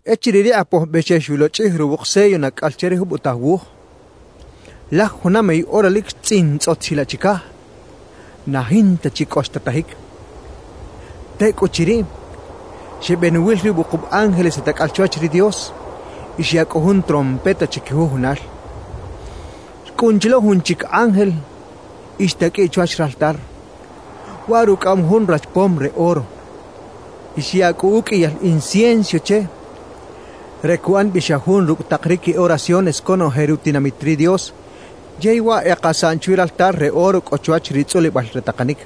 Echiriꞌ ri Kꞌapoj Bexex xulochꞌij ruwuk sello nacꞌal che ri jubotaj wuj, laj juna mey ora lic xtzꞌintzꞌot chilaꞌ chicaj, na jinta chi cꞌo xtatajic. Tecꞌuchiriꞌ, xebenuwil ri wukub ángeles e tacꞌal chwach ri Dios y xyaꞌ cꞌu jun trompeta chiquijujunal. Xcꞌun chi lo jun chic ángel y xtaqꞌuiꞌ chwach raltar. Waꞌ rucꞌaꞌam jun rachpom re oro. Y xyaꞌ cꞌu uqꞌuiyal incienso che re cuꞌan bi xa jun rucꞌ tak ri qui oraciones conoje rutinamit ri Dios yey waꞌ e kasaꞌn chwi raltar re oro cꞌo chwach ri tzꞌulibal re takanic.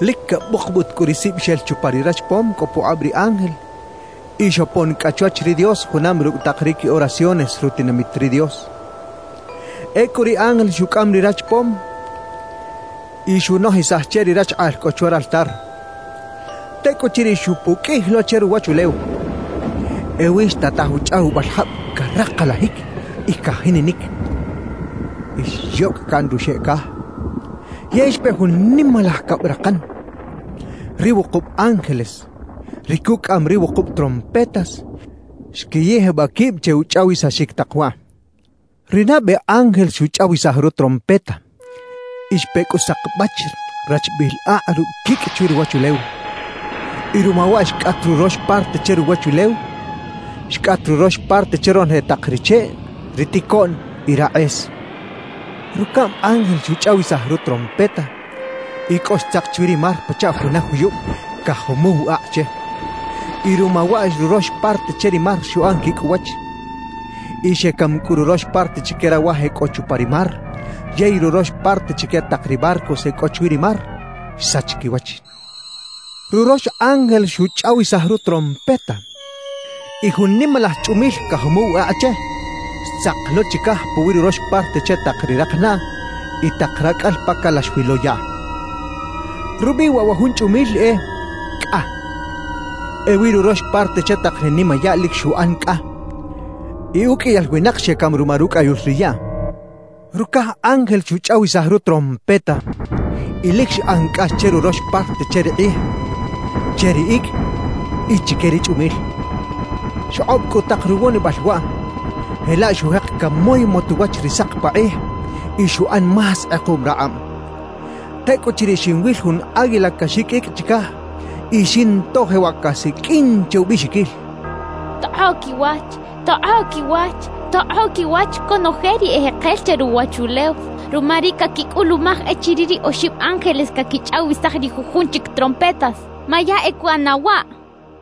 Lic cabukbut cꞌu ri sib xel chupa ri rachpom cꞌo pukꞌab ri ángel y xopon cꞌa chwach ri Dios junam rucꞌ tak ri qui oraciones rutinamit ri Dios. Ecꞌu ri ángel xucꞌam ri rachpom y xunojisaj che ri rachkꞌaꞌl cꞌo chwa raltar. Tecꞌuchiriꞌ xupuqꞌuij lo che ruwachulew. Ewi xtataj uchꞌawibal jab caraklajic y cajininic, y xyocꞌ caꞌn ruxeꞌ caj; yey xpe jun nimalaj cabrakan. Ri wukub ángeles, ri cucꞌaꞌam ri wukub trompetas, xquiyijbaꞌ quib che uchꞌawisaxic tak waꞌ. Ri nabe ángel xuchꞌawisaj rutrompeta, y xpe cꞌu sakbach rachbiꞌil akꞌ rucꞌ quicꞌ chwi ruwachulew. Y ruma waꞌ xcꞌat rurox parte che ruwachulew, xcꞌat rurox parte che ronoje tak ri cheꞌ, ri ticoꞌn y rakꞌes. Rucaꞌm ángel xuchꞌawisaj rutrompeta, y cꞌo xtzak chwi ri mar pachaꞌ juna juyub cajumuw akꞌ che. Y ruma waꞌ rurox parte che ri mar xuꞌan quicꞌ uwach. Y xecam cꞌu rurox parte chique rawaj e cꞌo chupa ri mar yey rurox parte chique tak ri barcos e cꞌo chwi ri mar, xsach quiwach. Rurox ángel xuchꞌawisaj rutrompeta, y jun nimalaj chꞌumil cajumuw akꞌ che xtzak lo chicaj puwi rurox parte che tak ri rakanaꞌ y tak racꞌal pa calax wi lo yaꞌ. Rubiꞌ waꞌ wa jun chꞌumil e “Cꞌa”. Ewi rurox parte che tak ri nimayaꞌ lic xuꞌan cꞌa; y uqꞌuiyal winak xecam ruma rucꞌayul ri yaꞌ. Rucaj ángel xuchꞌawisaj rutrompeta, y lic xꞌan cꞌax che rurox parte che ri kꞌij, che ri icꞌ y chique ri chꞌumil. Xkꞌob cꞌu tak ruwonibal waꞌ, jelaꞌ xujek camoymot uwach ri sak pakꞌij y xuꞌan más kꞌekuꞌm rakꞌab. Tecꞌuchiriꞌ xinwil jun águila caxiqꞌuicꞌ chicaj y xinto jewaꞌ casiqꞌuin che ubiꞌxiquil: «¡Tokꞌoꞌ quiwach! ¡Tokꞌoꞌ quiwach! ¡Tokꞌoꞌ quiwach conoje ri ejekel che ruwachulew ruma ri caquicꞌulumaj echiriꞌ ri oxib ángeles caquichꞌawisaj ri jujun chic trompetas! ¡Ma ya e cuꞌana waꞌ!» cachaꞌ.